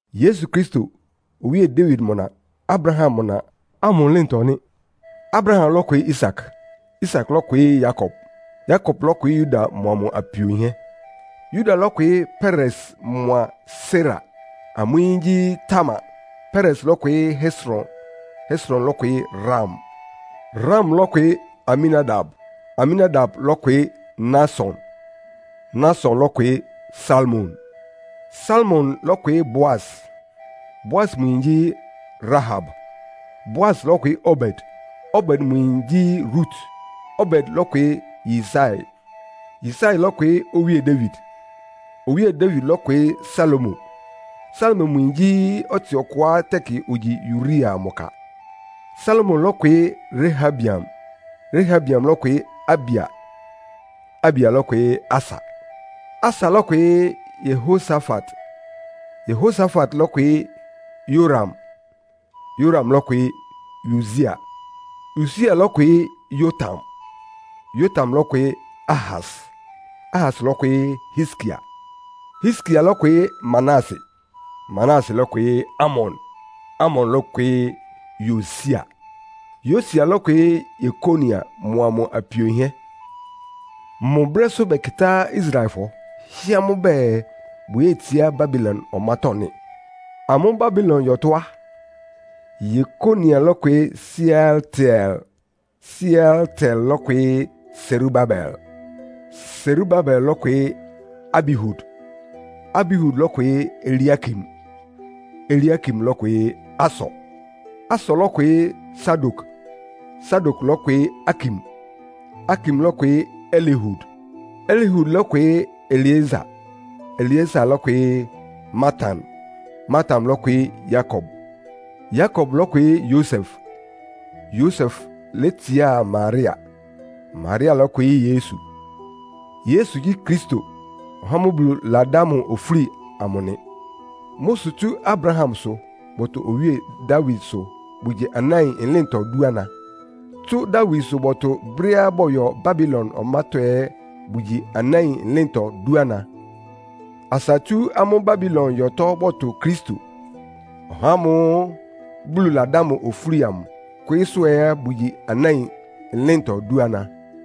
Yesu Kristo, Owíe Dawid mʋ na, Abraham mʋ na ámʋ ɩlɩ́ntɔ nɩ́. Abraham lɔ́kwɩɩ́ Isak. Isak lɔ́kwɩɩ́ Yakob. Yakob lɔ́kwɩɩ́ Yuda mʋa mʋ apio yinhɛ́. Yuda lɔ́kwɩɩ́ Peres mʋa Sera. Amʋ́ yín gyí Tamar. Peres lɔ́kwɩɩ́ Hesron. Hesron lɔ́kwɩɩ́ Ram. Ram lɔ́kwɩɩ́ Aminadab. Aminadab lɔ́kwɩɩ́ Nahson. Nahson lɔ́kwɩɩ́ Salmon. Salmon lɔ́kwɩɩ́ Boas. Boas mʋ yin gyí Rahab. Boas lɔ́kwɩɩ́ Obed. Obed mʋ yin gyí Rut. Obed lɔ́kwɩɩ́ Yisai. Yisai lɔ́kwɩɩ́ Owíe Dawid. Owíe Dawid lɔ́kwɩɩ́ Salomo. Salomo mʋ yin gyí ɔtsɩ ɔkʋá tɛkɩ ogyi Uria mʋ ka. Salomo lɔ́kwɩɩ́ Rehabeam. Rehabeam lɔ́kwɩɩ́ Abia. Abia lɔ́kwɩɩ́ Asa. Asa lɔ́kwɩɩ́ Yehosafat. Yehosafat lɔ́kwɩɩ́ Yoram. Yoram lɔ́kwɩɩ́ Usia. Usia lɔ́kwɩɩ́ Yotam. Yotam lɔ́kwɩɩ́ Ahas. Ahas lɔ́kwɩɩ́ Hiskia. Hiskia lɔ́kwɩɩ́ Manase. Manase lɔ́kwɩɩ́ Amon. Amon lɔ́kwɩɩ́ Yosia. Yosia lɔ́kwɩɩ́ Yekonia mʋa mʋ apio yinhɛ́. Mʋ brɛ́sʋ́ bɛkɩtá Israelfɔ, hɩ́ɛ́ amʋ́ bɛɛ bʋyétsiá Babilon ɔmátɔ́ nɩ́. Amʋ́ Babilon yɔtɔ́ á, Yekonia lɔ́kwɩɩ́ Sealtiel. Sealtiel lɔ́kwɩɩ́ Serubabel. Serubabel lɔ́kwɩɩ́ Abihud. Abihud lɔ́kwɩɩ́ Eliakim. Eliakim lɔ́kwɩɩ́ Asor. Asor lɔ́kwɩɩ́ Sadok. Sadok lɔ́kwɩɩ́ Akim. Akim lɔ́kwɩɩ́ Elihud. Elihud lɔ́kwɩɩ́ Eleasar. Eleasar lɔ́kwɩɩ́ Matan. Matan lɔ́kwɩɩ́ Yakob. Yakob lɔ́kwɩɩ́ Yosef, Yosef létsiá Maria. Maria lɔ́kwɩɩ́ Yesu. Yesu gyí Kristo, (ɔhá ámʋ́ʋ́ Bulu ladá mʋ ofúli amʋ) nɩ. Mʋ́ sʋ tsú Abrahamsʋ bɔtʋ Owíe Dawidsʋ bʋgyi anáin ɩlɩ́ntɔ dúana. Tsú Dawidsʋ bɔtʋ brɛ́á bɔyɔ Babilon ɔmátɔ́ ɛ́ bʋgyi anáin ɩlɩ́ntɔ dúana. Asa tsú amʋ́ Babilon yɔtɔ́ bɔtʋ Kristo, (ɔhá ámʋ́ʋ́ Bulu ladá mʋ ofúli amʋ) kwɩɩ́sʋ́ ɛ́ bʋgyi anáin ɩlɩ́ntɔ dúana.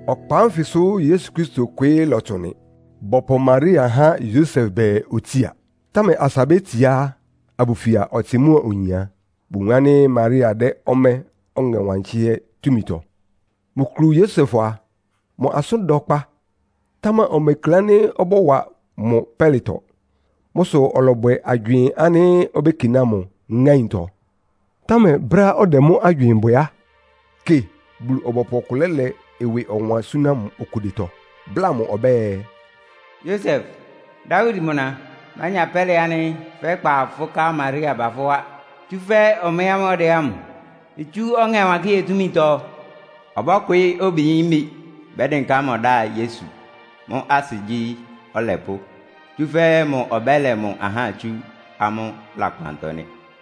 Ɔkpa ánfɩsʋ Yesu Kristo kwɩɩ́ lɔtsʋn nɩ. Bɔpʋ Maria há Yosef bɛɛ otsía. Támɛ asa bétsiá, abʋfia ɔtsɩ mʋ́a oyin á, bowun ánɩ́ Maria dɛ́ ɔmɛ́ Ɔŋɛ Wankɩ́hɛ́ túmitɔ. Mʋ kulu Yosef a, mʋ asʋ́n da ɔkpa, támɛ omekle ánɩ́ ɔbɔ́wa mʋ pɛ́lɩtɔ. Mʋ́ sʋ ɔlɔbwɛ agywɩɩn ánɩ́ obékiná mʋ ŋáintɔ. Támɛ brɛ́á ɔdɛ mʋ́ agywɩɩn bwɛ á, kɩ, Bulu-ɔbɔpʋ ɔkʋ lɛ́lɛ ɩwɩ ɔwan súná mʋ okudetɔ, bláa mʋ ɔbɛ́ɛ, “Yosef, Dawid mʋ na, mánya pɛ́lɩ ánɩ́ fɛ́kpa fʋ́ ká Maria ba fʋ́ wá, tsúfɛ́ ɔmɛ́ ámʋ́ʋ́ ɔdɛ ámʋ itsú Ɔŋɛ Wankɩ́hɛ́ túmitɔ. Ɔbɔ́kwɩɩ́ obiyímbi, bɛ́dɩnká mʋ dá Yesu. (Mʋ́ asɩ gyí, ‘Ɔlɛpʋ́.’) Tsúfɛ́ mʋ ɔbɛ́lɛ mʋ ahá tsú amʋ́ lakpantɔ nɩ́.”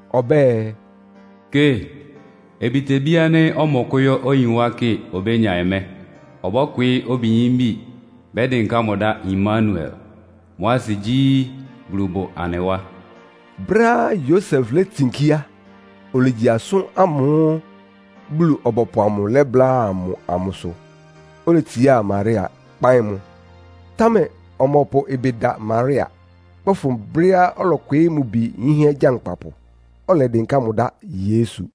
Ɔbɛ́ɛ, “Kɩ, obitebí ánɩ́ ɔmɔkʋ́yɔ́ oyin wá kɩ obénya ɔmɛ́. Ɔbɔ́kwɩɩ́ obiyímbi, bɛ́dɩnká mʋ dá Imanuel.” (Mʋ́ asɩ gyí, “Bulu bʋ anɩ wá.”) Brɛ́á Yosef létsinkí á, olegyi asʋ́n ámʋ́ʋ́ Bulu-ɔbɔpʋ amʋ lɛ́bláa mʋ amʋsʋ. Oletsiá Maria, kpáɩ́n mʋ. Támɛ ɔmɔpʋ ɩbɩ da Maria, kpɛ́fʋn brɛ́á ɔlɔkwɩɩ́ mʋ bi yínhɛ́ gyankpapʋ, ɔlɛdɩnká mʋ dá Yesu.